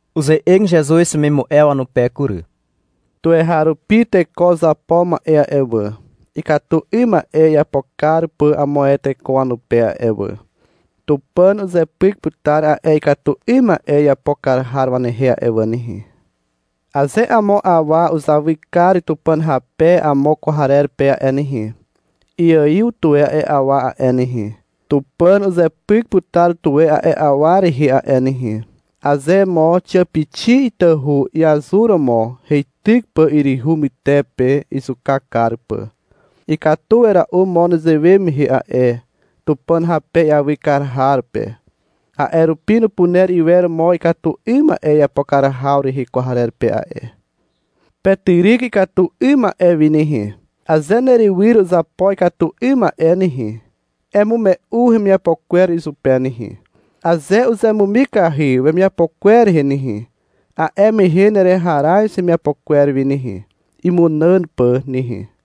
Uze'eg Zezuz wemimu'e wanupe kury. — Tuweharupi teko uzapo ma'e a'e wà, ikatu 'ym ma'e iapo kar pà amo ae teko wanupe a'e wà. Tupàn uzepyk putar a'e ikatu 'ym ma'e iapo kar har wanehe a'e wà nehe. Aze amo awa uzawy kar Tupàn rape amo kwarer pe a'e nehe, iaiw tuwe a'e awa a'e nehe. Tupàn uzepyk putar tuwe a'e awa rehe a'e nehe. Aze mo xiàpixi itahu iazuromo heityk pà yryhu pytepe izuka kar pà, ikatu wera'u mo nezewe mehe a'e Tupàn rape iawy kar har pe. A'e rupi nupuner iwer mo ikatu 'ym ma'e iapo kar haw rehe kwarer pe a'e. Petyryk ikatu 'ym ma'e wi nehe. Aze nerywyr uzapo ikatu 'ym ma'e nehe, emume'u hemiapo kwer izupe nehe. Aze uzemumikahy wemiapo kwer rehe nehe, a'e mehe nereharaz hemiapo kwer wi nehe, imunàn pà nehe.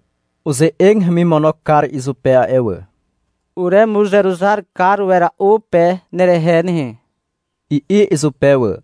Uze'eg hemimono kar izupe a'e wà. — Uremuzeruzar kar wera'u pe nerehe nehe, i'i izupe wà.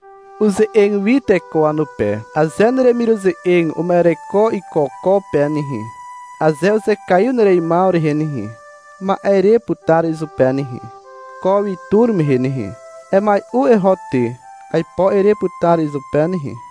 Uze'eg wi teko wanupe. — Aze neremiruze'eg uma'ereko iko ko pe nehe, aze uzekaiw nereimaw rehe nehe, ma'e ere putar izupe nehe, ko wi tur mehe nehe. Emai'u eho ty, aipo ere putar izupe nehe.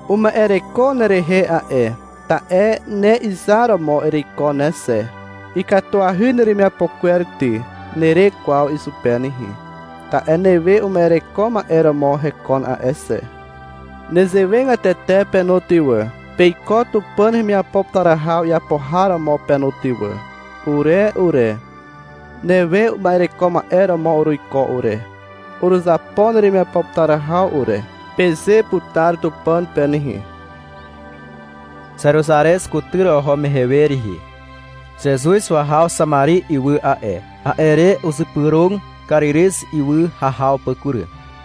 Uma'ereko nerehe a'e, ta'e ne izar romo ereiko ne xe. — Ikatuahy neremiapo kwer ty, nere kwaw izupe nehe, ta'e newe uma'ereko ma'e romo hekon a'e xe. Nezewegatete pe no ty wà. Peiko Tupàn hemiapo putar haw iapo har romo pe no ty wà. — Ure ure, newe uma'ereko ma'e romo uruiko ure. Uruzapo neremiapo putar haw ure, peze putar Tupàn pe nehe. Zeruzarez kutyr oho mehe we rihi, Zezuz wahaw Xamari ywy a'e. A'e re uzypyrog Karirez ywy hahaw pà kury.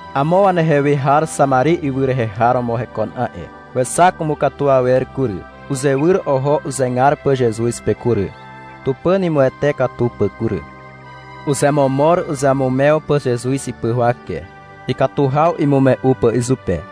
Amo wanehe we har Xamari ywy rehe har romo hekon a'e, wexak umukatu awer kury. Uzewyr oho uzegar pà Zezuz pe kury. Tupàn imuwete katu pà kury. Uzemomor uzeamumew pà Zezuz ipy huwake, ikatu haw imume'u pà izupe.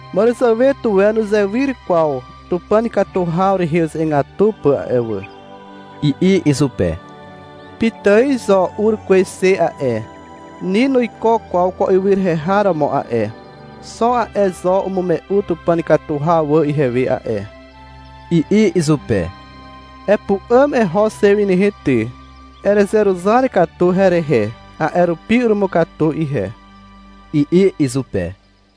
— Màràzàwe tuwe nuzewyr kwaw Tupàn ikatu haw rehe uze'egatu pà a'e wà, i'i izupe. — Pitài zo ur kwez xe a'e. Ni nuiko kwaw ko ywy rehe har romo a'e, xo a'e zo umume'u Tupàn ikatu haw wà ihewe a'e, i'i izupe. — Epu'àm eho xe wi nehe ty, erezeruzar katu herehe, a'e rupi urumukatu ihe, i'i izupe.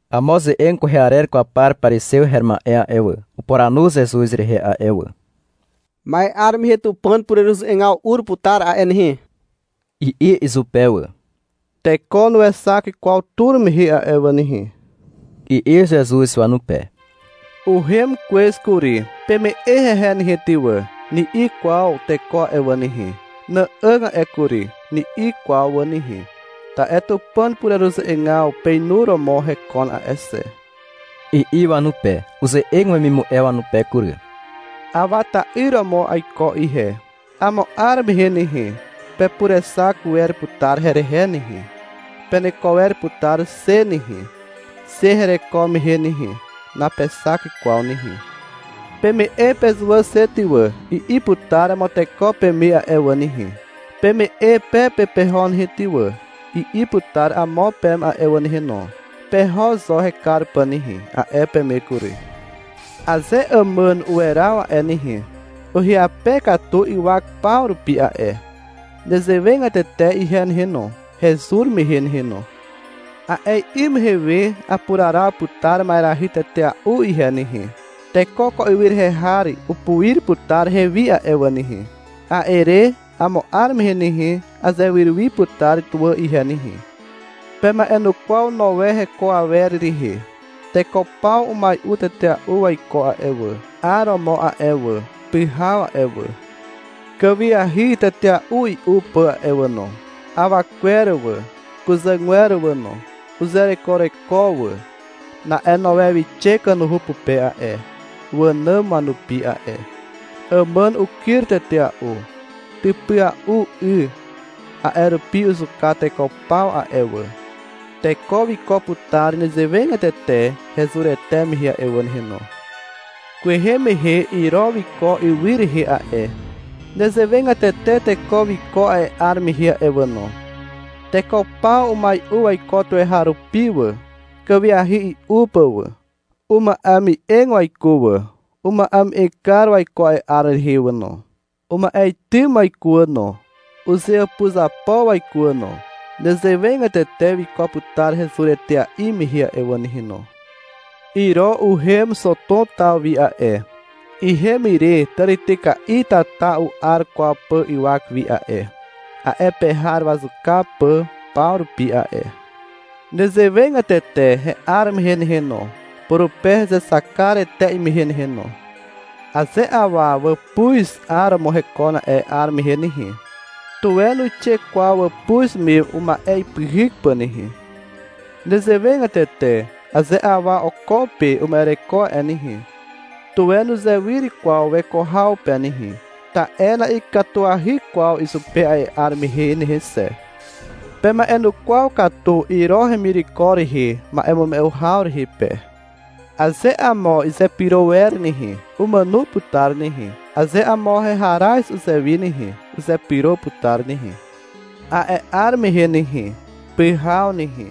Amo ze'eg kwehe arer kwaw par parizew her ma'e a'e wà, upuranu Zezuz rehe a'e wà. — Ma'e 'ar mehe Tupàn pureruze'egaw ur putar a'e nehe, i'i izupe wà. — Teko nuexak kwaw tur mehe a'e wà nehe, i'i Zezuz wanupe. — Uhem kwez kury, peme'e hehe nehe ty wà, ni'i kwaw teko a'e wà nehe. — Nà'àg a'e kury, ni'i kwaw wà nehe. Ta'e Tupàn pureruze'egaw peinuromo hekon a'e xe, i'i wanupe. Uze'eg wemimu'e wanupe kury. — Awa ta'yr romo aiko ihe. Amo 'ar mehe nehe, pepurexak wer putar herehe nehe. Peneko wer putar xe nehe, xe hereko mehe nehe. Napexak kwaw nehe. — Peme'e pezuwà xe ty wà, i'i putar amo teko peme a'e wà nehe. — Peme'e pe pe peho nehe ty wà, i'i putar amo peme a'e wà nehe no. — Peho zo hekar pà nehe, a'e peme kury. Aze àmàn uweraw a'e nehe, uhyape katu ywak paw rupi a'e. Nezewegatete ihe nehe no, hezur mehe nehe no. A'e 'ym mehe we apuraraw putar ma'erahy tetea'u ihe nehe. Teko ko ywy rehe har upuir putar hewi a'e wà nehe. A'e re, amo 'ar mehe nehe, azewyr wi putar tuwà ihe nehe. Pema'enukwaw Noe heko awer rehe. Teko paw umai'u tetea'u waiko a'e wà, 'aromo a'e wà, pyhaw a'e wà, kàwiahy tetea'u i'u pà a'e wà no. Awa kwer wà, kuzàgwer wà no, uzerekoreko wà. Na'e Noe wixe kanuhu pupe a'e, (wànàm wanupi a'e). Àmàn ukyr tetea'u. Typya'u 'y. A'e rupi uzuka teko paw a'e wà. Teko wiko putar nezewegatete hezurete mehe a'e wà nehe no. Kwehe mehe Iro wiko ywy rehe a'e. Nezewegatete teko wiko a'e 'ar mehe a'e wà no. Teko paw umai'u waiko tuweharupi wà, kàwiahy i'u pà wà. Uma'eme'eg waiko wà, uma'eme'eg kar waiko a'e 'ar rehe wà no. Uma'etym waiko wà no. Uzeàpuzapo waiko wà no. Nezewegatete wiko putar hezur etea'i mehe a'e wà nehe no. Iro uhem Xotom taw wi a'e. Ihem ire tàrityka'i tata u'ar kwaw pà ywak wi a'e, a'e pe har wazuka pà paw rupi a'e. Nezewegatete he'ar mehe nehe no, purupe hezexak kar etea'i mehe nehe no. Aze awa wàpuz 'aromo hekon a'e 'ar mehe nehe, tuwe nuixe kwaw wàpuz me uma'e ipyhyk pà nehe. Nezewegatete aze awa oko pe uma'ereko a'e nehe, tuwe nuzewyr kwaw weko haw pe nehe. Ta'e na'ikatuahy kwaw izupe a'e 'ar mehe nehe xe. Pema'enukwaw katu Iro hemireko rehe ma'emume'u haw rehe pe. Aze amo izepyro wer nehe, umàno putar nehe. Aze amo heharaz uzewi nehe, uzepyro putar nehe. A'e 'ar mehe nehe, pyhaw nehe,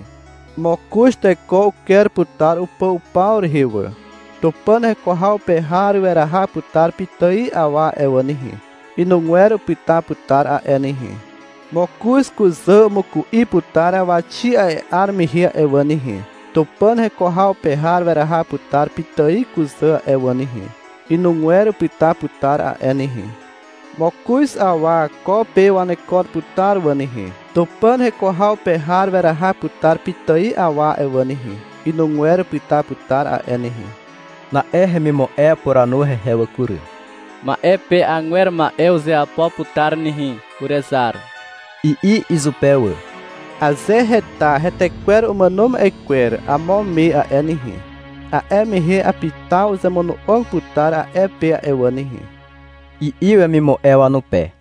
mokoz teko uker putar upà upaw rehe wà. Tupàn heko haw pe har weraha putar pitài awa a'e wà nehe, inugwer upyta putar a'e nehe. Mokoz kuzà umuku'i putar awaxi a'e 'ar mehe a'e wà nehe. Tupàn heko haw pe har weraha putar pitài kuzà a'e wà nehe, inugwer upyta putar a'e nehe. Mokoz awa ko pe wanekon putar wà nehe. Tupàn heko haw pe har weraha putar pitài awa a'e wà nehe, inugwer upyta putar a'e nehe. Na'e hemimu'e upuranu hehe wà kury. — Ma'e pe agwer ma'e uzeapo putar nehe, urezar, i'i izupe wà. — Aze heta hetekwer umàno ma'e kwer amo me a'e nehe, a'e mehe apitaw uzemono'og putar a'e pe a'e wà nehe, i'i wemimu'e wanupe.